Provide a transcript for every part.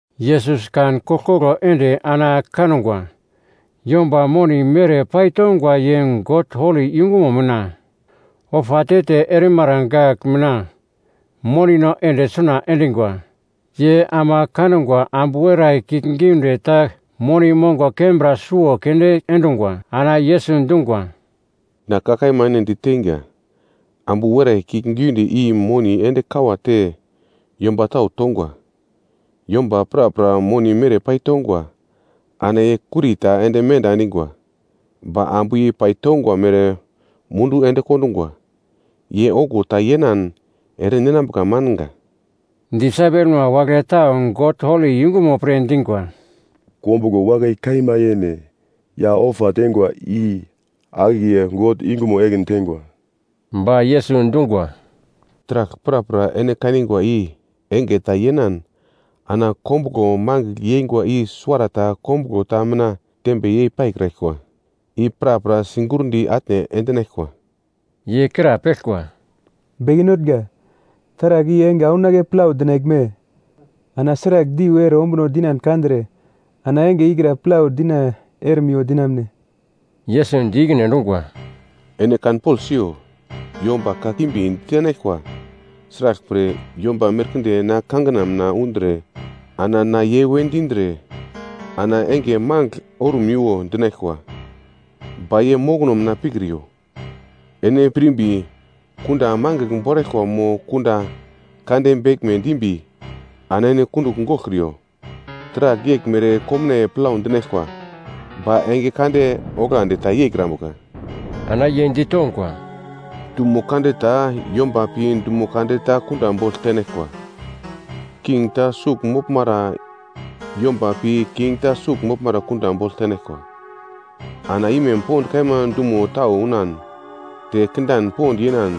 Yesus kan koglkoglo ende ana kangwa yomba moni mere paitongwa ye God holi yungumo mina ofa te-te erimara gagl mina monino ende suna endingwa. Ye ama kangwa ambu werai kiuglgiunde ta moni mongo kembra suwo keunde endungwa. Ana Yesus dungwa, “Na ka kaima ene diteinga, ambu werai kiuglgiunde i moni ende kawate yomba tau tongwa. Yomba prapra moni mere paitongwa, ana ye kuri ta te menda endingwa, ba ambu i paitongwa mere mundu ende kondungwa. Ye okuwo ta yenan ere ninambuka manga.” Disaipelma wagle tau God holi yungumo pre dingwa, “Kombuglo wakai kaima yene ya ofa teingwa i akiye God yungumo ekin teingwa.” Ba Yesus dungwa, “Taragl prapra ene kanigwa i enge ta yenan ana kombuglo mangigl yeingwa i suwarata kombuglo ta mina tembe yei paikraglkwa, i prapra sigurndi atne endinaglkwa.” Ye krapeglkwa, “Beke Notnga, taragl i enge aunake plau dinaglme? Ana sragl diu ere ombuno dinan kandre, ana enge ikra plau dina erimiwo dinamune?” Yesus di ikine endungwa, “Ene kanpogl siyo, yomba kakimbi ditenaglkwa. Sraglpre, yomba merkinde na kangina mina undre ana ‘Na ye’ we dindre, ana ‘Enge mangigl orumiwo’ dinaglkwa. Ba ye mokono mina pikriyo. Ene pirmbi kunda mangigl boraglkwa mo kunda kande beglme dimbi ana ene kundugl goglkriyo, taragl yeglmere komnaiye plau dinaglkwa, ba enge kande oglandi ta yeikrambuka.” Ana ye ditongwa, “Dumo kande ta yomba pi dumo kande ta kunda bogl tenaglkwa, king ta sugl moglmara yomba pi king ta sugl moglmara kunda bogl tenaglkwa. Ana imem pond kaima dumo tau unan te kindan pond yenan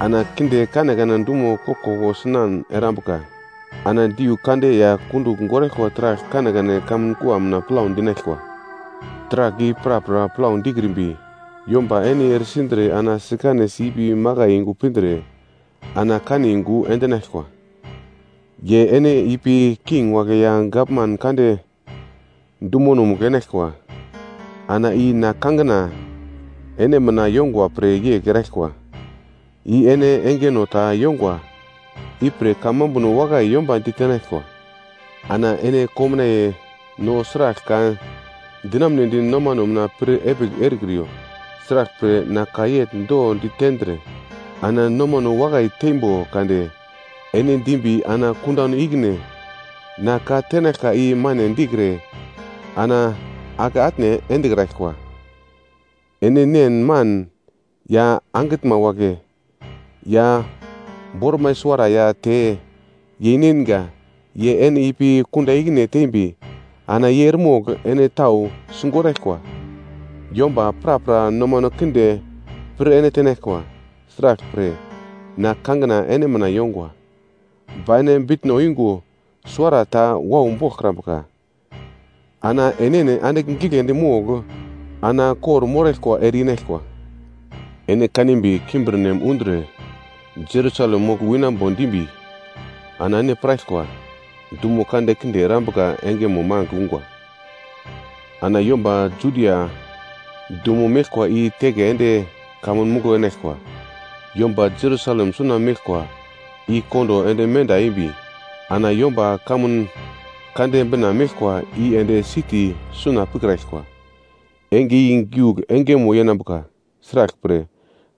ana kinde kanekane dumo koglkoglo sinan erambuka. Ana diu kande ya kundugl goraglkwa taragl kanekane kamun kua mina plau dinaglkwa. “Taragl i prapra plau dikrimbi, yomba ene eresindre ana sikanesi ipi makai yungu pindre ana kane yungu endinaglkwa. Ye ene ipi king wagle ya gavman kande dumonomugl enaglkwa, ana i na kangina ene mina yongwa pre yegl eraglkwa. I ene engeno ta yongwa, ipre kamambuno wakai yomba ditenaglkwa. Ana ene komnaiye no sragl ka dinamunedi nomano mina pir epigl erekriyo. Sraglpre, na ka yegl do ditendre, ana nomano wakai teimbo kade ene dimbi ana kundano ikine na ka tenaglkwa i mane dikre ana ake atne endekraglkwa. Ene nen man ya angitnma wagle ya bormai suwara ya te yeinengwa ye ene ipi kunda ikine tembi ana ye eremogl ene tau sigoraglkwa. Yomba prapra nomano kinde pir ene tenaglkwa, sraglpre, na kangina ene mina yongwa. Ba ene bitno yungo suwara ta wau boglkrambuka. Ana enene andigl giglendi mogl ana kor-moraglkwa ere-inaglkwa. “Ene kanimbi kimbirnem undre Jerusalem mogl winambo dimbi ana ene piraglkwa, dumo kande kinde erambuka engemo mangigl ungwa. Ana yomba Judia dumo meglkwa i teke ende kamun muglo enaglkwa, yomba Jerusalem suna meglkwa i kondo ende menda embi, ana yomba kamun kande bina meglkwa i ende siti suna pikraglkwa. Enge i giugl engemo yenambuka, sraglpre,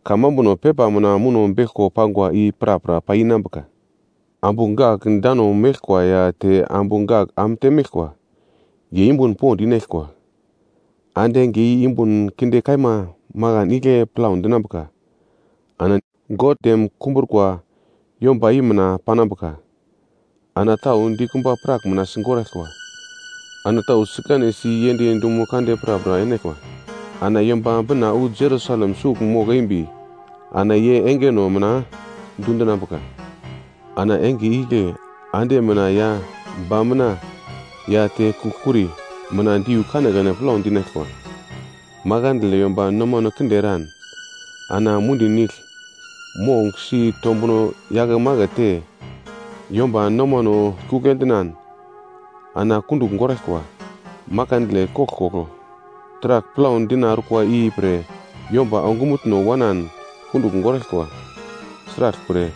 kamambuno pepa mina muno beglkwa pangwa i prapra pai inambuka. Ambu gak dano meglkwa ya te ambu gak am temeglkwa, ye yumbun pond inaglkwa. Ande enge i yumbun kinde kaima makan igle plau dinambuka ana God dem kumbrukwa yomba i mina panambuka. Ana tau dikumba prak mina sigoraglkwa, ana tau sikanesi yend dumo kande prapra enaglkwa, ana Yomba Bina wu Jerusalem sugl mogl eimbi ana ye engeno mina dundinambuka. “Ana enge igle ande mina ya ba mina ya te kugl kuri mina diu kanekane plau dinaglkwa. Makandle yomba nomano kinde eran, ana mundi nigl mong sitombuno yakemakete yomba nomano sikugl endinan ana kundugl goraglkwa. Makandle koglkoglo taragl plau dina orkwa ipre yomba ongumutno wanan kundugl goraglkwa, sraglpre,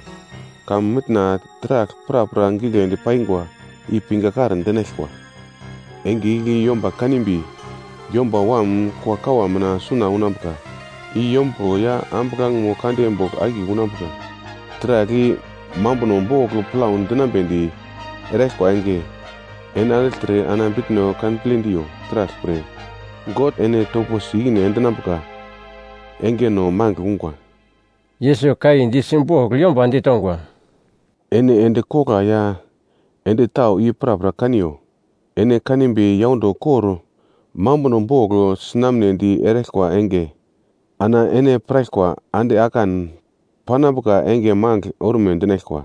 kamun mitna taragl prapra giglendi paingwa i pingakar dinaglkwa. Enge igle yomba kanimbi Yomba Wam kuakawa mina suna unambuka i yombuglo ya ambuglangemo kande bogl akiye unambuka. Taragl i mambuno bogl plau dinamunedi eraglkwa enge, ene andigltre ana bitno kanple diyo, sraglpre, God ene toposi ikine endinambuka engeno mangigl ungwa.” Yesus ka i di simbogl yomba ditongwa, “Ene endi kogla ya endi tau i prapra kaniyo. Ene kanimbi yaundo kor mambuno bogl sinamnedi erikwa enge, ana ene piraglkwa ande akan panambuka enge mangigl orume dinaglkwa.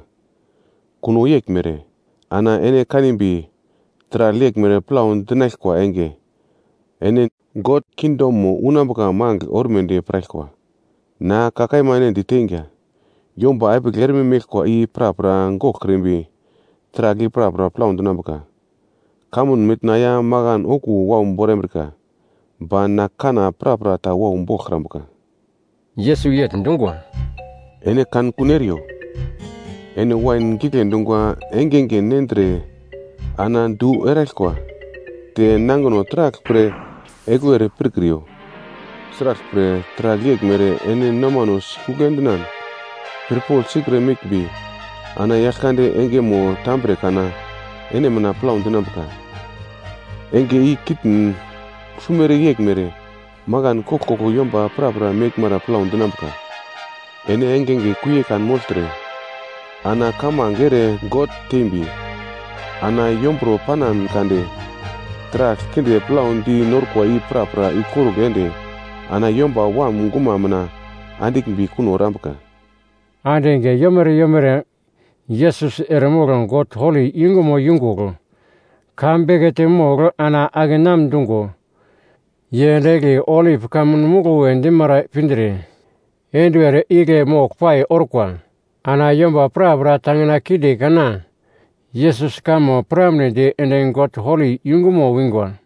Kuno yeglmere ana ene kanimbi taragl yeglmere plau dinaglkwa enge, ene God kingdomo unambuka mangigl ormedi piraglkwa. “Na ka kaima ene diteinga, yomba epigl erme meglkwa i prapra goglkrimbi taragl i prapra plau dinambuka. Kamun mitna ya makan okuwo wau borambrika. Ba na kanna prapra ta wau boglkrambuka.” Yesus yegl dungwa, “Ene kankun eriyo. Ene wain gigle dungwa engenge nendre ana du erekraglkwa. Te nangino taragl pre egluwe ere pirkriyo, sraglpre, taragl yeglmere ene nomano sikugl endinan pirpogl sikre meglmbi, ana Yaglkande engemo tambre kana ene mina plau dinambuka. Enge i kitn sumere yeglmere makan koglkoglo yomba prapra meglmara plau dinambuka. Ene engenge kuie kanmogltre ana kamange ere God tembi, ana yombro panan kade taragl kinde plau dina orkwa i prapra ikorugl ende ana Yomba Wam guma mina andiglmbi kuno erambuka.” Ande enge yomere yomere Yesus eremogl God holi yungumo yungugl ka bekete mogl ana akenam dungo ye ende egli Olip Kamun Muglo we dimara pindre enduwer igle moglpai orkwa. Ana yomba prapra tangina kinde kana Yesus kamo piramnedi ende God holi yungumo wingwa.